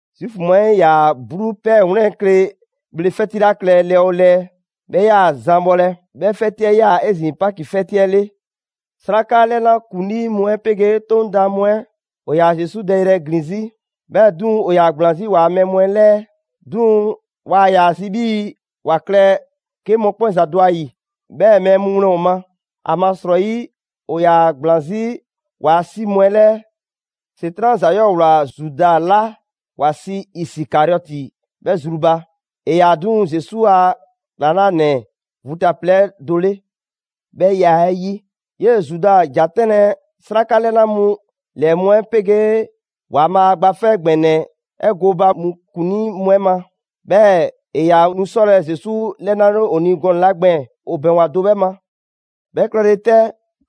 Zuufu mu 'ɛ 'yaa‑ 'bluu ‑pɛɛ 'wlɛn kle bhle 'fɛti 'la klɛ lɛɛ 'oo lɛɛ, 'bhɛ 'yaa‑ zan bhɔlɛ. 'Bhɛ 'fɛti 'ɛ 'yaa‑ 'ezin‑ Paki 'fɛti 'ɛ 'le. 'Sraka 'lɛna ‑kuŋlii mu 'ɛ 'pegee 'Toŋ daan mu 'ɛ ‑o ‑yaa Zesu dɛyrɛ ‑glin 'zi, 'bhɛɛ‑ 'duŋ‑ ‑o ‑yaa ‑gblaan 'zi waa mɛɛ mu 'ɛ 'lɛɛ. 'Duŋ‑, waa ‑yaa zi 'bhii‑ ‑wa klɛ 'ke mɔkpɛn' ‑za dɔ ‑a 'yi, 'bhɛɛ‑ mɛɛ mu wlɛn ‑o ma, ‑amasrɔyi ‑o ‑yaa ‑gblaan 'zi ‑waa' 'si mu 'ɛ 'lɛɛ. ‑Setran' ‑za 'yɔɔ‑ ꞊wlaa Zuda 'la ‑wa sii Isikariɔti 'bhɛ zru ba: ‑e ‑yaa 'duŋ‑ Zesu ‑a ‑klaŋlanɛ vu ta plɛ 'ɛ do 'le. 'Bhɛ ya 'ɛ 'yi, 'yee‑ Zuda ‑ja 'tɛnlɛ‑ 'sraka 'lɛna mu ‑lɛɛ mu 'ɛ 'pegee ‑Waanbhaa' Gba 'Fɛ ‑Gbɛnɛ 'ɛ gooba mu ‑kuŋlii mu 'ɛ ma. 'Bhɛɛ‑ ‑e ‑yaa nu 'sɔlɛ‑ Zesu 'lɛnale ‑o ni gɔnɛ‑ 'la gbɛɛn‑, ‑o ‑bɛŋgwa do 'bhɛ ma. 'Bhɛ klɛle 'tɛ,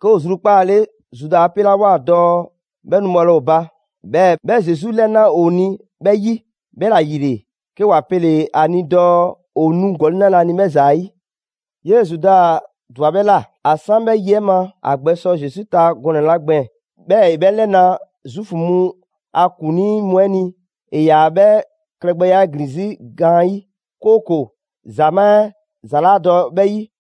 'ke ‑o zrukpaale Zuda 'a 'pelawoa dɔɔ 'bhɛ nu bhɔlɛ ‑o ba, 'bhɛɛ‑ 'bhɛ Zesu 'lɛna‑ ‑o ni 'bhɛ 'yi. 'Bhɛla‑ ‑yile 'ke ‑wa pele‑ ‑a ni dɔɔ ‑o nu ‑gɔli' 'nalɛ‑ ‑a ni 'bhɛ ‑za 'ɛ 'yi. 'Yee‑ Zuda ‑dwa 'bhɛ ꞊la. ‑A 'san 'bhɛ yi 'ɛ ma, ‑a gbɛ sɔ Zesu ta gɔnɛ‑ 'la gbɛɛn‑ 'bhɛɛ‑ ‑e 'bhɛ 'lɛna‑ Zuufu mu a ‑kuŋlii mu 'ɛ ni, ‑e yaa‑ 'bhɛɛ‑ klɛgbɛya 'ɛ ‑glin 'zi gaanyi', 'kooko‑ ‑zamaa' 'ɛ ‑za 'laa dɔ 'bhɛ 'yi.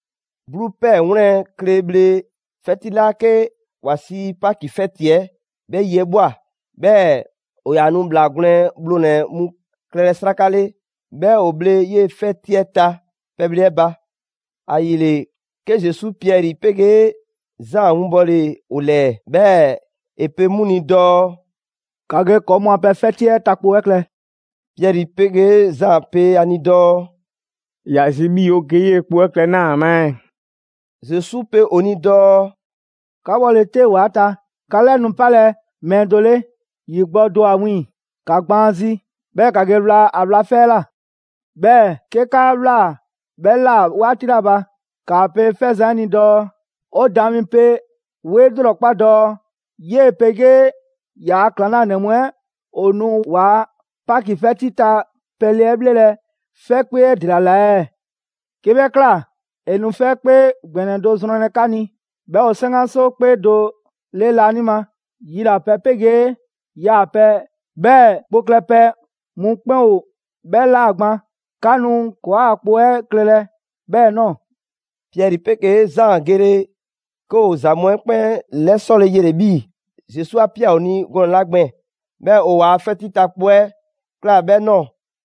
'Bluu ‑pɛɛ 'wlɛn‑ kle bhle 'fɛti 'la 'ke ‑wa sii Paki 'fɛti 'ɛ, 'bhɛ yi 'ɛ ꞊bhwa, 'bhɛɛ‑ ‑o ‑yaa nu ‑bhlaa gwlɛn bhlonɛ‑ mu klɛlɛ 'sraka 'le, 'bhɛɛ‑ ‑woo bhle 'yee‑ 'fɛti 'ɛ ta pɛbhle 'ɛ ba. ‑Ayile, 'ke Zesu Piɛri 'pegee Zaan winbɔle ‑o ‑lɛɛ, 'bhɛɛ‑ ‑e pe 'mu ni dɔɔ: «‑Ka ge ‑kɔɔ mu a pɛ 'fɛti 'ɛ ta kpo 'ɛ klɛ.» Piɛri 'pegee Zaan pe ‑a ni dɔɔ: «꞊Ya zi 'bhii‑ 'o ge 'yee‑ kpo 'ɛ klɛ 'naa‑ ma ɛɛ?» Zesu pe ‑o ni dɔɔ: «'Ka 'bhɔle‑ 'te ‑wa 'ɛ ta, 'ka 'lɛ nu 'palɛ‑ mɛɛ do 'le, ‑yi gbɔ do ‑o ‑a wiiŋ‑. ‑Ka gbaan ‑a zi, 'bhɛɛ‑ ‑ka ge wla ‑a wla 'fɛ 'ɛ ꞊la. 'Bhɛɛ‑ 'ke 'ka ꞊wlaa 'bhɛ ꞊la 'waati 'la ba, ‑kaa pe 'fɛzan‑ 'ɛ ni dɔɔ: ‹'O Daan mi 'pe 'wo 'e 'lrɔkpa dɔɔ 'yee‑ 'pegee ‑yaa' ‑klaŋlanɛ mu 'ɛ ‑o nu ‑waa' Paki 'fɛti ta pɛle 'ɛ 'bhlelɛ‑ 'fɛkpee 'ɛ ‑dela ꞊la ɛɛ?› 'Ke 'bhɛ ꞊kla, ‑e nu 'fɛkpee ‑gbɛnɛ do zrɔnlɛ 'ka ni, 'bhɛ ‑o 'saŋgaso 'kpee do 'le laanima. Yilapɛ 'pegee yaapɛ, 'bhɛɛ‑ kpo klɛpɛ mu 'kpɛn ‑o 'bhɛ ‑la gban, 'ka nu ‑kɔɔa' kpo 'ɛ klɛlɛ 'bhɛɛ‑ ꞊nɔɔ.» Piɛri 'pegee Zaan gele, 'ke ‑o ‑za mu 'ɛ 'kpɛn 'lɛsɔle yele‑ 'bhii‑ Zesu 'a ꞊pia ‑o ni gɔnɛ‑ 'la gbɛɛn‑. 'Bhɛɛ‑ ‑o ‑waa' 'fɛti ta kpo 'ɛ ꞊kla 'bhɛɛ‑ ꞊nɔɔ.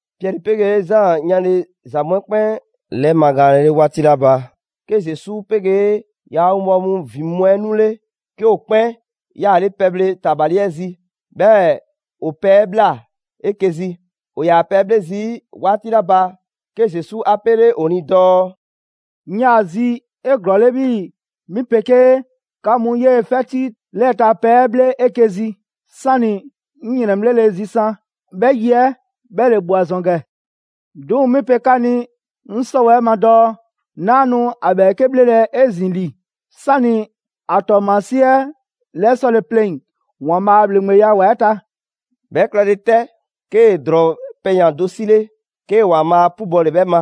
Piɛri 'pegee Zaan 'yanle‑ ‑za mu 'ɛ 'kpɛn 'lɛmagaanle 'le 'waati 'la ba, 'ke Zesu 'pegee ‑yaa' winbɔwo mu ‑vin mu 'ɛ 'nule, 'ke ‑o 'kpɛn 'yaale pɛbhle ‑tabali 'ɛ zi, 'bhɛɛ‑ ‑o pɛ 'ɛ ꞊bhla 'eke‑ zi. ‑O ‑yaa pɛ 'ɛ 'bhle zii' 'waati 'la ba, 'ke Zesu 'a 'pele ‑o ni dɔɔ: «'Ŋ 'yaa‑ ‑a zi 'eglɔɔle 'bhii‑ 'mi 'pegee 'ka mu 'yee‑ 'fɛti 'lɛɛ‑ ta pɛ 'ɛ 'bhle 'eke‑ zi, 'sani‑ 'ŋ ‑yrɛnbhlele zisan; 'bhɛ yi 'ɛ 'bhɛ ‑le ꞊bhwa ‑zɔn ‑gɛ. 'Duŋ‑ 'mi pe 'ka ni 'ŋ 'sɔwɛɛ‑ ma dɔɔ: 'Naa nu ‑a ‑bhɛɛke' 'bhlelɛ‑ 'ezin‑ ‑li, 'sani‑ ‑a ‑tɔɔmasie 'ɛ 'lɛsɔle pleŋ‑ ‑Waanbhaa' a ‑bhleŋgbeya ‑wa 'ɛ ta.» 'Bhɛ klɛle 'tɛ, 'kee‑ ‑drɔɔ pɛyan‑ do 'sile, 'kee‑ ‑Waanbhaa' 'pubɔle 'bhɛ ma,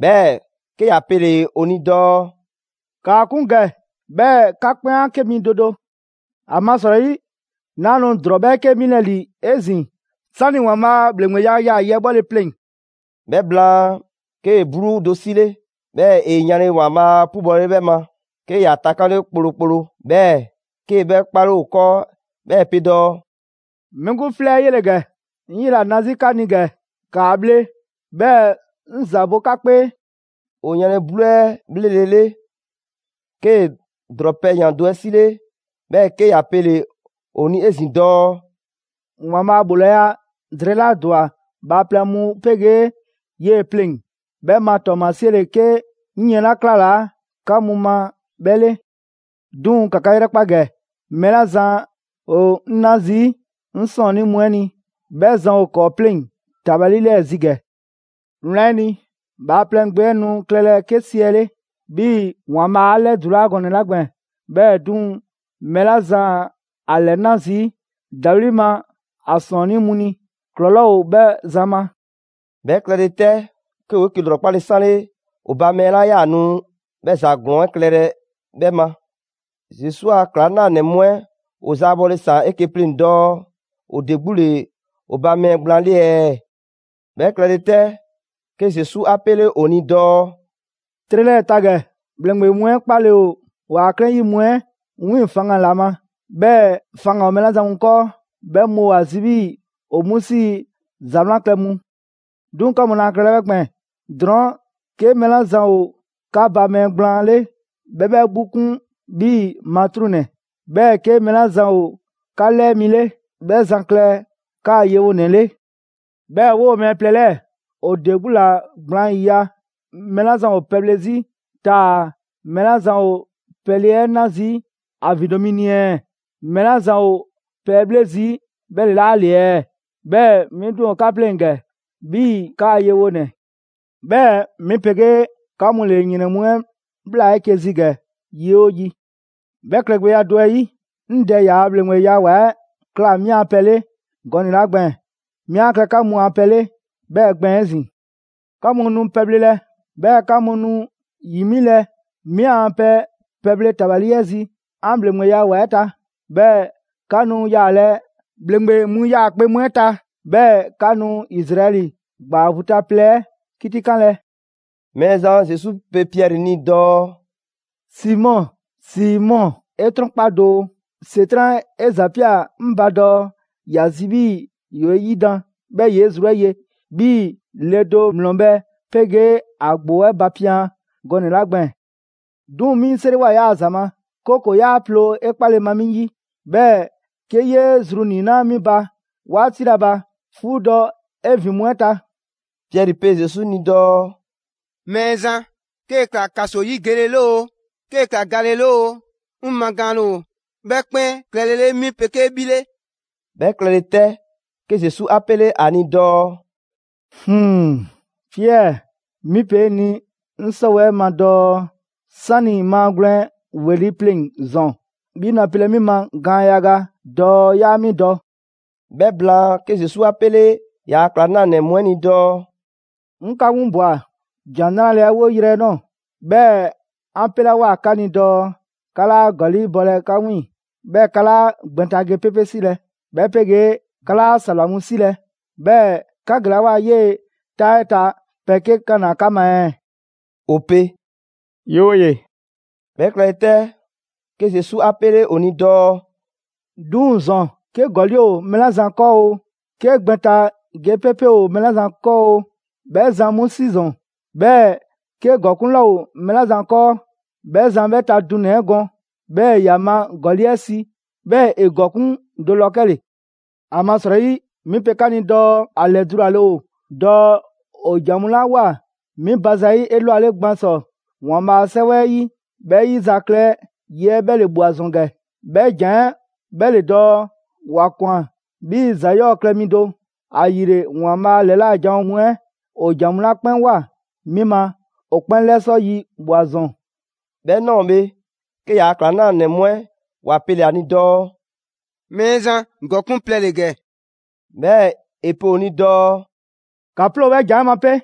'bhɛɛ‑ 'ke ‑ya pele‑ ‑o ni dɔɔ: «‑Kaa 'kun ‑gɛ 'bhɛɛ‑ 'ka 'kpɛn 'a 'ke 'mi do do. ‑Amasrɔyi 'naa nu ‑drɔɔ 'bhɛɛke 'milɛ‑ ‑li 'ezin‑ 'sani‑ ‑Waanbhaa' ‑bhleŋgbeya yaa‑ yi 'ɛ bhɔle pleŋ‑.» 'Bhɛ blaan, 'kee‑ 'bluu do 'sile, 'bhɛɛ‑ ‑e yanle ‑Waanbhaa' 'pubɔlele 'bhɛ ma, 'ke ‑ya takanle kplokplo. 'Bhɛɛ‑ 'kee‑ 'bhɛ 'kpale ‑o 'kɔɔ, 'bhɛɛ‑ ‑e pe dɔɔ: «'Mi 'gbu 'flɛ 'ɛ 'yele‑ ‑gɛ, 'ŋ 'yela‑ na 'zi 'ka ni ‑gɛ. ‑Kaa bhle 'bhɛɛ‑ 'ŋ ‑za bo 'ka 'kpee.» ‑O yanle 'bluu 'ɛ 'bhlelele, 'kee‑ ‑drɔɔ pɛyan‑ do 'ɛ 'sile, 'bhɛɛ‑ 'ke ‑ya pele‑ ‑o ni 'ezin‑ dɔɔ: «‑Waanbhaa' ‑bhoolaya drɛɛ 'la ‑dwa bhaaplɛŋ mu 'pegee 'yee‑ pleŋ‑, 'bhɛ ma ‑tɔɔmasie ‑le 'ke 'ŋ yiɛn 'la 'klalaa‑ 'ka mu ma 'bhɛ 'le.» «'Duŋ‑ ‑ka 'ka 'yrɛkpa ‑gɛ, mɛɛ 'la zan ‑o 'ŋ 'na zii' 'ŋ 'sɔɔnnii mu 'ɛ ni 'bhɛ zan ‑o ‑kɔɔ' 'pleŋ‑ ‑tabali 'lɛɛ‑ zi ‑gɛ. Wlan 'ɛ ni, Bhaaplɛŋ Gbe 'ɛ nu klɛlɛ 'ke siɛle' 'bhii‑ ‑Waanbhaa' a 'lɛdulaa gɔnɛ‑ 'la gbɛɛn‑. 'Bhɛɛ‑ 'duŋ‑, mɛɛ 'la zan ‑a 'lɛna zii' ‑dawli' ma ‑a ‑sɔɔnnii' mu ni, ‑klɔlɔɔ' ‑o 'bhɛ zan ma!» 'Bhɛ klɛle 'tɛ, 'ke ‑woo 'eke‑ ‑lrɔkpale 'sanle ‑o ba mɛɛ 'la 'yaa‑ nu 'bhɛ ‑za ‑glɔɔn 'ɛ klɛlɛ 'bhɛ ma. Zesu a ‑klaŋlanɛ mu 'ɛ ‑o zaabɔle ‑saan 'eke‑ pleŋ‑ dɔɔ ‑o ‑de 'gbu ‑le ‑o ba mɛɛ gblaan 'le ɛɛ. 'Bhɛ klɛle 'tɛ, 'ke Zesu 'a 'pele ‑o ni dɔɔ: «'Trɛ 'lɛɛ‑ ta ‑gɛ, ‑bhleŋgbe mu 'ɛ 'kpaale‑ ‑o waa 'klɛɛn 'yi mu 'ɛ 'wiiŋ‑ faŋgan‑ ‑la ma. 'Bhɛɛ‑ faŋgan‑ ‑o mɛɛ 'la zan mu 'kɔɔ, 'bhɛ mu ‑o ‑a zi 'bhii‑ ‑o 'mu 'sii‑ ‹‑Za 'wlan klɛ mu› 'Duŋ‑ 'ka mu laa klɛlɛ 'bhɛ gbɛɛn‑. Drɔɔn' 'ke mɛɛ 'la zan ‑o 'ka ba mɛɛ gblaan 'le, 'bhɛ 'bhɛ 'gbu 'kun 'bhii‑ matruŋnɛ. 'Bhɛɛ‑ 'ke mɛɛ 'la zan ‑o 'ka 'lɛɛ mi 'le, 'bhɛ zan klɛ 'kaa‑ yewonɛ 'le. 'Bhɛɛ‑ 'woo‑ mɛɛ plɛ 'lɛɛ‑, ‑o de 'gbu ‑la gblaan ‑yiya': mɛɛ 'la zan ‑o pɛbhle 'zi taa‑ mɛɛ 'la zan ‑o pɛle 'ɛ 'na zii' ‑a ‑vindo' mi ni ɛɛ? Mɛɛ 'la zan ‑o pɛ 'ɛ 'bhle zii' 'bhɛ ‑le 'laa ‑le ɛɛ? 'Bhɛɛ‑ 'mi 'duŋ‑ ‑o 'ka 'pleŋ‑ ‑gɛ 'bhii‑ 'kaa‑ yewonɛ! 'Bhɛɛ‑ 'mi 'pegee 'ka mu ‑le ‑yrɛn mu 'ɛ ꞊bhla 'eke‑ zi ‑gɛ yi 'oo yi. 'Bhɛ klɛgbɛya do 'ɛ 'yi, 'ŋ Dɛ ‑yaa' ‑bhleŋgbeya ‑wa 'ɛ ꞊kla 'mi a pɛ 'le gɔnɛ‑ 'la gbɛɛn‑, 'mi 'a klɛ 'ka mu a pɛ 'le 'bhɛɛ‑ gbɛɛn‑ 'ezin‑. 'Ka mu nu pɛbhlelɛ, 'bhɛɛ‑ 'ka nu ‑yi 'milɛ‑ 'mi 'an pɛ pɛbhle tabali 'ɛ zi 'an ‑Bhleŋgbeya ‑wa 'ɛ ta. 'Bhɛɛ‑ 'ka nu yaalɛ ‑bhleŋgbe mu 'yaakpe‑ mu 'ɛ ta, 'bhɛɛ‑ 'ka nu Izraɛli ‑gbaa vu ta plɛ 'ɛ 'kitikanlɛ.» Mɛɛzan Zesu pe Piɛri ni dɔɔ: «Simɔ, Simɔ, 'e 'trɔnkpa doo, ‑Setran' 'e ‑zapia 'ŋ ba dɔɔ ‑ya zi 'bhii‑ ‑yoo 'e 'yidan‑, 'bhɛɛ‑ ‑yoo 'e zru 'ɛ ye, 'bhii‑ le do ‑mlɔ bhɛ 'pegee ‑a ‑gboo 'ɛ bapian gɔnɛ‑ 'la gbɛɛn‑. 'Duŋ‑ 'mi 'ŋ 'seriwoa 'yaa‑ ‑za ma, 'kooko‑ 'yaa ploo 'e 'kpale‑ ma 'mi 'yi. 'Bhɛɛ‑ 'ke 'yee zru 'niinaa 'mi ba 'waati 'la ba, 'fuudɔ‑ 'e ‑vin mu 'ɛ ta.» Piɛri pe Zesu ni dɔɔ: «Mɛɛzan, 'kee‑ ‑kla ‑kaso 'yi gele 'le oo, 'kee‑ ‑kla gale 'le oo, 'ŋ magaanle ‑o 'bhɛ 'kpɛn klɛlele 'mi 'pegee 'bhi 'le.» 'Bhɛ klɛle 'tɛ, 'ke Zesu 'a 'pele ‑a ni dɔɔ: «Piɛri 'mi pe 'e ni 'ŋ 'sɔwɛɛ‑ 'ɛ ma dɔɔ 'sani‑ maagwlɛn ‑weli' pleŋ‑ ‑zɔn, 'bhi nu a pelɛ 'mi ma gaan yaga dɔɔ 'yaa 'mi dɔ.» 'Bhɛ blaan, 'ke Zesu 'a 'pele ‑yaa' ‑klaŋlanɛ mu 'ɛ ni dɔɔ: «'Ŋ 'ka 'winlabwa ‑Jan 'Nrale‑ 'ɛ 'woyrɛ‑ nɔɔ‑, 'bhɛɛ‑ 'an 'pelawoa 'ka ni dɔɔ 'ka 'laa ‑gɔli' bɔlɛ 'ka 'wiiŋ‑, 'bhɛɛ‑ 'ka 'laa gbɛn ta ge 'pepe 'silɛ‑, 'bhɛ 'pegee 'ka 'laa ‑sawla mu 'silɛ‑, 'bhɛɛ‑ 'ka gelawoa 'yee‑ 'taa 'ɛ ta, pɛ 'ke 'kanaa 'ka ma ɛɛ?» ‑O pe «'Yooye‑!» 'Bhɛ klɛle 'tɛ, 'ke Zesu 'a 'pele ‑o ni dɔɔ: «'Duŋ‑ ‑zɔn, 'ke ‑gɔli' ‑o mɛɛ 'la zan 'kɔɔ oo, 'ke gbɛn ta ge 'pepe ‑o mɛɛ 'la zan 'kɔɔ 'oo, 'bhɛ zan 'mu 'si ‑zɔn. 'Bhɛɛ‑ 'ke ‑gɔkuŋ' 'laa ‑o mɛɛ 'la zan 'kɔɔ, 'bhɛ zan 'bhɛ ta dunɛ‑ 'ɛ gɔn, 'bhɛɛ‑ ‑ya ma ‑gɔli' 'ɛ si, 'bhɛɛ‑ ‑e ‑gɔkuŋ' do ‑lɔ 'kɛle‑. ‑Amasrɔyi 'mi pe 'ka ni dɔɔ ‑a ‑lɛdulale ‑o dɔɔ ‑o ‑jan mu 'la ꞊woa 'mi ba zayi' 'elwale gban ‑sɔ ‑Waanbhaa' a 'sɛwɛ 'ɛ 'yi, 'bhɛ 'yizaklɛ yi 'ɛ 'bhɛ ‑le ꞊bhwa ‑zɔn ‑gɛ, 'bhɛ ‑jan 'ɛ 'bhɛ ‑le dɔɔ: ‹‑Wa ꞊kwan 'bhii‑ ‑za 'yɔɔ‑ klɛ mi do›. ‑Ayile ‑Waanbhaa' ‑lɛla' janwo mu 'ɛ ‑o ‑jan mu 'la 'kpɛn ꞊woa 'mi ma, ‑o 'kpɛn 'lɛsɔ yi ꞊bhwa ‑zɔn.» 'Bhɛ ꞊nɔɔ bhe, 'ke ‑yaa' ‑klaŋlanɛ mu 'ɛ ‑wa pele‑ ‑a ni dɔɔ: «Mɛɛzan, ‑gɔkuŋ' plɛ ‑le ‑gɛ.» 'Bhɛɛ‑ ‑e pe ‑o ni dɔɔ: «‑Ka 'ploo‑ 'bhɛ ‑jan 'ɛ ma 'pe!»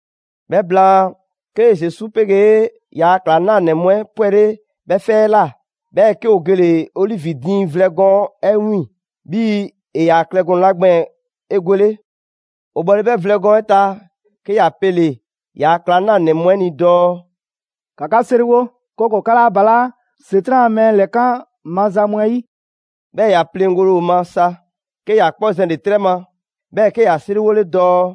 'Bhɛ blaan, 'ke Zesu 'pegee ‑yaa' ‑klaŋlanɛ mu 'ɛ 'pwɛle 'bhɛ 'fɛ 'ɛ ꞊la. 'Bhɛɛ‑ 'ke ‑o gele‑ Olivi diiŋ vlɛ gɔɔn 'ɛ 'wiiŋ‑, 'bhii‑ ‑e ‑yaa klɛ gɔnɛ‑ 'la gbɛɛn‑ 'egwele. ‑O bhɔle 'bhɛ vlɛ gɔɔn 'ɛ ta, 'ke ‑ya pele‑ ‑yaa' ‑klaŋlanɛ mu 'ɛ ni dɔɔ: «‑Ka 'ka 'seriwo, 'kooko‑ 'ka 'laa balaa' ‑Setran' a mɛɛ ‑lɛkan' maza mu 'ɛ 'yi.» 'Bhɛɛ‑ ‑ya pleŋgole ‑o ma sa, 'ke ‑ya 'kpɔ zɛnle‑ 'trɛ ma, 'bhɛɛ‑ 'ke ‑ya 'seriwole dɔɔ: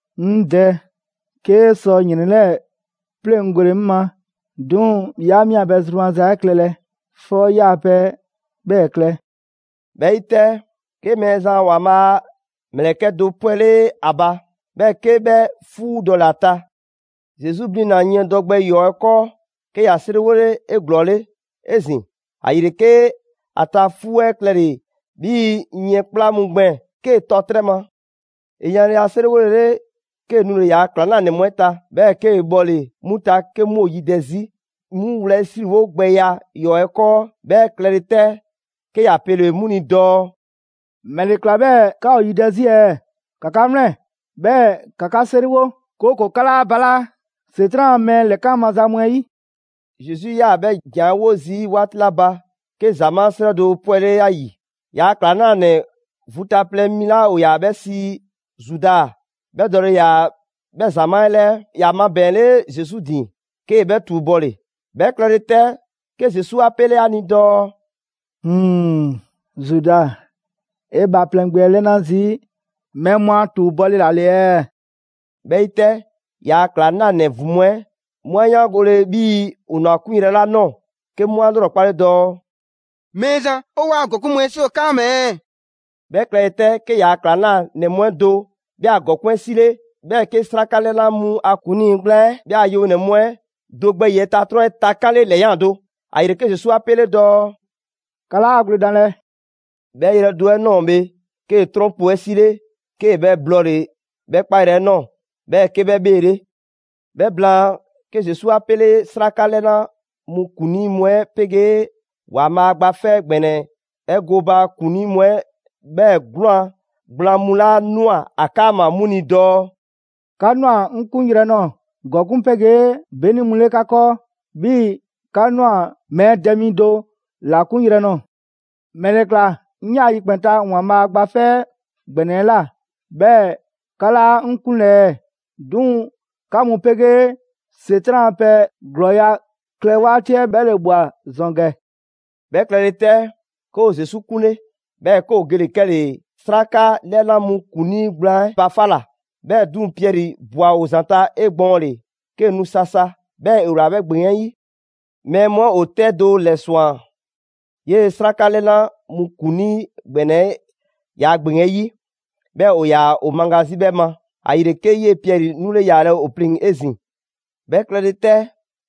«'Ŋ Dɛ, 'kee sɔ ‑yrɛn 'lɛɛ‑ 'pleŋgole 'ŋ ma. 'Duŋ‑ 'yaa 'mi a pɛ zru maza 'ɛ klɛlɛ, 'fɔ 'yaa‑ pɛ 'ɛ 'bhɛɛ‑ klɛ.» ['Bhɛ 'yi 'tɛ, 'ke Mɛɛzan ‑Waanbhaa' a ‑mlɛkɛ' do 'pwɛle ‑a ba, 'bhɛɛ‑ 'ke 'bhɛ 'fuudɔle ‑a ta. Zesu blina‑ yiɛndɔ gbɛ ‑yɔɔ 'ɛ 'kɔɔ, 'ke ‑ya 'seriwole 'eglɔɔle 'ezin‑. ‑Ayile 'ke ‑a ta 'fuu 'ɛ klɛle‑ 'bhii‑ yiɛn 'kpla mu gbɛɛn‑ 'kee‑ tɔ 'trɛ ma.] ‑E yanle ‑a 'seriwolele, 'kee‑ nule‑ ‑yaa' ‑klaŋlanɛ mu 'ɛ ta, 'bhɛɛ‑ 'kee‑ bhɔle‑ 'mu ta 'ke 'mu ‑o yidɛ 'zi 'mu wlɛyisriwo gbɛya ‑yɔɔ' 'ɛ 'kɔɔ. 'Bhɛ klɛle 'tɛ, 'ke ‑ya pele‑ 'mu ni dɔɔ: «‑Mɛle ‑kla 'bhɛɛ‑ 'ka ‑o yidɛ 'zi ɛɛ? ‑Ka 'ka 'wlɛn‑, 'bhɛɛ‑ ‑ka 'ka 'seriwo, 'kooko‑ 'ka 'laa balaa' ‑Setran' a mɛɛ ‑lɛkan maza mu 'ɛ yi.» Zesu 'yaa‑ 'bhɛ ‑jan 'ɛ 'wo zii' 'waati 'la ba, 'ke ‑zamaa' 'srɛ do 'pwɛle ‑a ‑yi. ‑Yaa' ‑klaŋlanɛ vu ta plɛ mi 'la ‑o ‑yaa 'bhɛ sii Zuda 'bhɛ dɔle ‑yaa 'bhɛ ‑zamaa' 'ɛ 'lɛɛ. ‑Ya mabɛɛnle Zesu ‑din, 'kee‑ 'bhɛ ‑tuubɔle. 'Bhɛ klɛle 'tɛ, 'ke Zesu 'a 'pele 'a ni dɔɔ: «Zuda, 'e Bhaaplɛŋ Gbe 'ɛ 'lɛna zii' mɛɛ mu ‑a ‑tuubɔle ‑la ‑le ɛɛ?» 'Bhɛ 'yi 'tɛ, ‑yaa' ‑klaŋlanɛ ‑vin mu 'ɛ 'mu 'a 'yaangole 'bhii‑ ‑o ꞊nwa ‑a 'kunyrɛ‑ ‑la nɔɔ‑, 'ke 'mu 'a ‑lrɔkpale dɔɔ: «Mɛɛzan, 'o 'waa‑ ‑gɔkuŋ' mu 'ɛ 'si ‑o 'kaama‑ ɛɛ?» 'Bhɛ klɛle 'tɛ, 'ke ‑yaa' ‑klaŋlanɛ mu 'ɛ do 'bhɛ a ‑gɔkuŋ' 'ɛ 'sile, 'bhɛɛ‑ 'kee‑ 'sraka 'lɛna mu a ‑kuŋlii gblaan 'ɛ 'bhɛ a yewonɛ mu 'ɛ do gbɛ ‑yiɛ' ta 'trɔn 'ɛ takanle ‑lɛyan' do. ‑Ayile, 'ke Zesu 'a 'pele dɔɔ: «'Ka 'laa gwledanlɛ.» 'Bhɛ yrɛ do 'ɛ ꞊nɔɔ bhe 'kee‑ 'trɔn kpu 'ɛ 'sile, 'kee‑ 'bhɛ blɔɔle‑ 'bhɛ 'kpayrɛ 'ɛ ꞊nɔɔ, 'bhɛɛ‑ 'ke 'bhɛ 'bheele. 'Bhɛ blaan, 'ke Zesu 'a 'pele 'sraka 'lɛna mu ‑kuŋlii mu 'ɛ 'pegee ‑Waanbhaa' Gba 'Fɛ ‑Gbɛnɛ 'ɛ gooba ‑kuŋlii mu 'ɛ, 'bhɛɛ‑ 'gwlaan‑ gblaan mu 'la ꞊nwa ‑a 'kaama‑ 'mu ni dɔɔ: «'Ka ꞊nwa 'ŋ 'kunyrɛ‑ nɔɔ‑ ‑gɔkuŋ' 'pegee 'beni mu 'le 'ka 'kɔɔ, 'bhii‑ 'ka ꞊nwa mɛɛ dɛ mi do ‑la 'kunyrɛ‑ nɔɔ‑.» «‑Mɛle ‑kla 'ŋ 'yaa‑ yikpɛn‑ ta ‑Waanbhaa' Gba 'Fɛ ‑Gbɛnɛ 'ɛ ꞊la, 'bhɛɛ‑ 'ka 'laa 'ŋ 'kunlɛ‑ ɛɛ? 'Duŋ‑ 'ka mu 'pegee ‑Setran' a pɛ ‑glɔɔya' klɛ 'waati 'ɛ 'bhɛ ‑le ꞊bhwa ‑zɔn ‑gɛ.» 'Bhɛ klɛle 'tɛ, 'ke ‑o Zesu 'kunle, 'bhɛɛ‑ 'ke ‑o gele‑ 'kɛle‑ 'sraka 'lɛna mu ‑kuŋlii gblaan 'ɛ ba 'fa ꞊la. 'Bhɛɛ‑ 'duŋ‑ Piɛri ꞊bwa ‑o ‑zanta' 'egbɔɔnle, 'kee‑ nu sasa, 'bhɛɛ‑ ‑e ꞊wlaa 'bhɛ ‑gbeŋ 'ɛ 'yi. Mɛɛ mu 'ɛ ‑o 'tɛ do ‑lɛswan 'yee‑ 'sraka 'lɛna mu ‑kuŋlii ‑gbɛnɛ 'ɛ ‑yaa' ‑gbeŋ 'ɛ 'yi, 'bhɛɛ‑ ‑o ‑yaa ‑o maga 'zi 'bhɛ ma. ‑Ayile 'ke 'yee‑ Piɛri 'nule yaalɛ ‑o pleŋ‑ 'ezin‑. 'Bhɛ klɛle 'tɛ,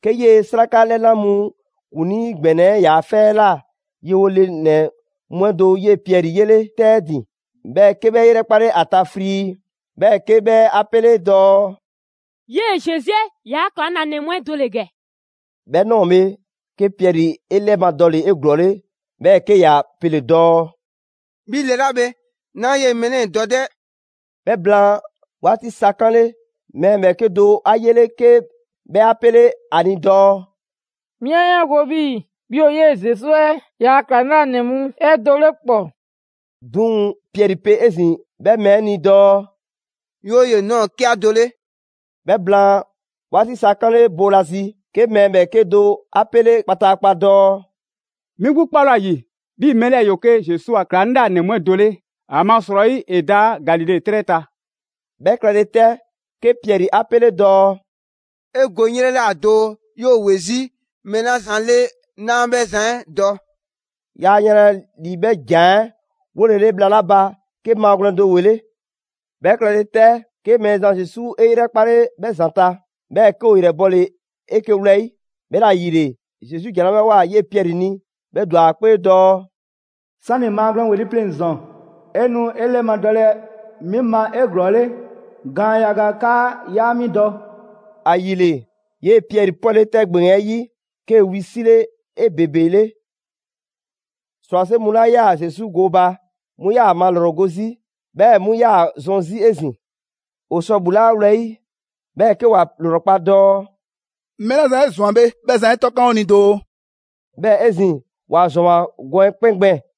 'ke 'yee‑ 'sraka 'lɛna mu ‑kuŋlii ‑gbɛnɛ 'ɛ ‑yaa' 'fɛ 'ɛ ꞊la yewo le ‑nɛ mu 'ɛ do 'yee‑ Piɛri 'yele‑ 'tɛ 'ɛ ‑din, 'bhɛɛ‑ 'ke 'bhɛ 'e 'yrɛkpale ‑a ta frii, 'bhɛɛ‑ 'ke 'bhɛ 'a 'pele dɔɔ: «'Yee‑ Zesu 'ɛ ‑yaa' ‑klaŋlanɛ mu 'ɛ do ‑le ‑gɛ!» 'Bhɛ ꞊nɔɔ bhe, 'ke Piɛri 'e 'lɛmadɔle 'eglɔɔle, 'bhɛɛ‑ 'ke ‑ya pele‑ dɔɔ: «'Bhi le 'la bhe, 'naa 'yee‑ mɛɛ 'lɛɛ‑ dɔ 'dɛ!» 'Bhɛ blaan 'waati sa 'kanle‑, mɛɛ ‑bhɛɛke' do 'a 'yele‑ 'ke 'bhɛ 'a 'pele 'a ni dɔɔ: «'Mi 'a 'yaango‑ 'bhii‑ 'bhi ‑o 'yee Zesu 'ɛ ‑yaa' ‑klaŋlanɛ mu 'ɛ do 'le ‑kpɔ!» 'Duŋ‑ Piɛri pe 'ezin‑ 'bhɛ mɛɛ 'ɛ ni dɔɔ: «'Yooye‑, 'naa ‑o 'ke 'a do 'le!» 'Bhɛ blaan 'waati sa 'kanle boolazi, 'ke mɛɛ ‑bhɛɛke' do 'a 'pele kpataakpa dɔɔ: «'Mi 'gbu 'kpale ‑o ‑a ‑yi 'bhii‑ mɛɛ 'lɛɛ‑ ‑yoo 'ke Zesu a ‑klaŋlanɛ mu 'ɛ do 'le, ‑amasrɔyi ‑e da Galile 'trɛ ta.» 'Bhɛ klɛle 'tɛ, 'ke Piɛri 'a 'pele dɔɔ: «'E go 'ŋ 'yrɛ ꞊la doo, 'yoo‑ ‑we 'zi mɛɛ 'la zan 'le 'naa 'bhɛ zan 'ɛ dɔ.» Yaa yanlɛ ‑li 'bhɛ ‑jan 'ɛ 'wolele bhla 'la ba, 'ke maagwlɛn do ‑wele'. 'Bhɛ klɛle 'tɛ, 'ke Mɛɛzan Zesu 'e 'yrɛkpale 'bhɛ ‑zanta', 'bhɛɛ‑ 'ke ‑o ‑yrɛ bɔle‑ 'eke‑ wlɛyi'. 'Bhɛla‑ ‑yile, Zesu ‑jan 'la 'bhɛ ꞊woa 'yee‑ Piɛri ni, 'bhɛ ‑dwa ‑a 'kpee dɔɔ: «'Sani‑ maagwlɛn ‑weli' pleŋ‑ ‑zɔn, 'e nu 'e 'lɛmadɔlɛ 'mi ma 'eglɔɔle gaan yaga 'kaa 'yaa 'mi dɔ.» ‑Ayile, 'yee‑ Piɛri 'pwɛle‑ 'tɛ ‑gbeŋ 'ɛ 'yi, 'kee‑ wisile 'ebebele. ‑Srwase' mu 'la 'yaa‑ Zesu gooba, 'mu 'yaa‑ ‑a malrɔgo 'zi, 'bhɛɛ‑ 'mu 'yaa‑ zɔn 'zi 'ezin‑. ‑O sɔ ‑bhulaa' 'a wlɛyi', 'bhɛɛ‑ 'ke ‑wa ‑lrɔkpa' dɔɔ: «Mɛɛ 'la zan 'e ꞊zwan bhe, 'bhɛ zan 'ɛ 'tɔkan 'o ni doo!» 'Bhɛɛ‑ 'ezin‑, ‑wa ‑zwanwoa gɔn 'ɛ 'kpɛn gbɛɛn‑.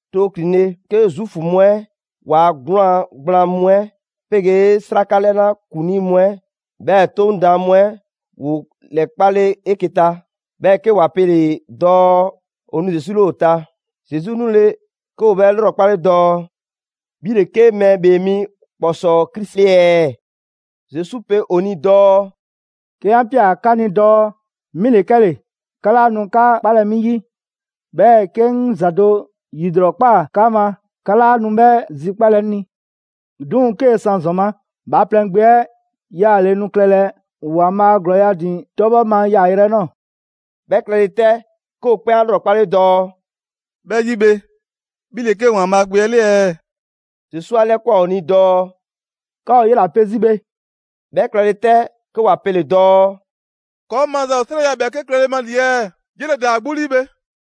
Too ‑klinle', 'ke Zuufu mu 'ɛ ‑waa' 'gwlaan‑ gblaan mu 'ɛ 'pegee 'sraka 'lɛna ‑kuŋlii mu 'ɛ, 'bhɛɛ‑ 'Toŋ daan mu 'ɛ ‑woo ‑lɛkpale 'eke‑ ta. 'Bhɛɛ‑ 'ke ‑wa pele‑ dɔɔ ‑o nu Zesu 'le ‑o ta. Zesu 'nule‑, 'ke ‑o 'bhɛ 'lrɔkpale dɔɔ: «'Bhi ‑le 'ke Mɛɛ ‑Bhee Mi ‑kpɔsɔɔ Krisi 'le ɛɛ?» Zesu pe ‑o ni dɔɔ: «'Ke 'an ꞊pia 'ka ni dɔɔ 'mi ‑le 'kɛle‑, 'ka 'laa nu 'ka 'kpalɛ‑ 'mi 'yi. 'Bhɛɛ‑ 'ke 'ŋ ‑za do ‑yilrɔkpaa 'ka ma, 'ka 'laa nu 'bhɛ zikpalɛ 'ŋ ni. 'Duŋ‑ 'kee‑ san ‑zɔn ma, Bhaaplɛŋ Gbe 'ɛ 'yaale‑ nu klɛlɛ ‑Waanbhaa' ‑glɔɔ ‑a ‑din 'tɔbhɔ ma yaayrɛ 'ɛ 'nɔɔ‑.» 'Bhɛ klɛle 'tɛ, 'ke ‑o 'kpɛn 'a 'lrɔkpale dɔɔ: «'Bhɛ 'yi bhe, 'bhi ‑le 'ke ‑Waanbhaa' Gbe 'ɛ 'le ɛɛ?» Zesu 'a 'lɛkwan꞊ ‑o ni dɔɔ: «'Ka ‑o 'yela‑ pe 'zi bhe.» 'Bhɛ klɛle 'tɛ, 'ke ‑wa pele‑ dɔɔ: «‑Kɔɔ' maza ‑o 'srɛya‑ ‑bhɛɛke' klɛle ma ‑li ɛɛ? 'Yele‑ ‑daa ‑a 'gbu 'lii bhe.»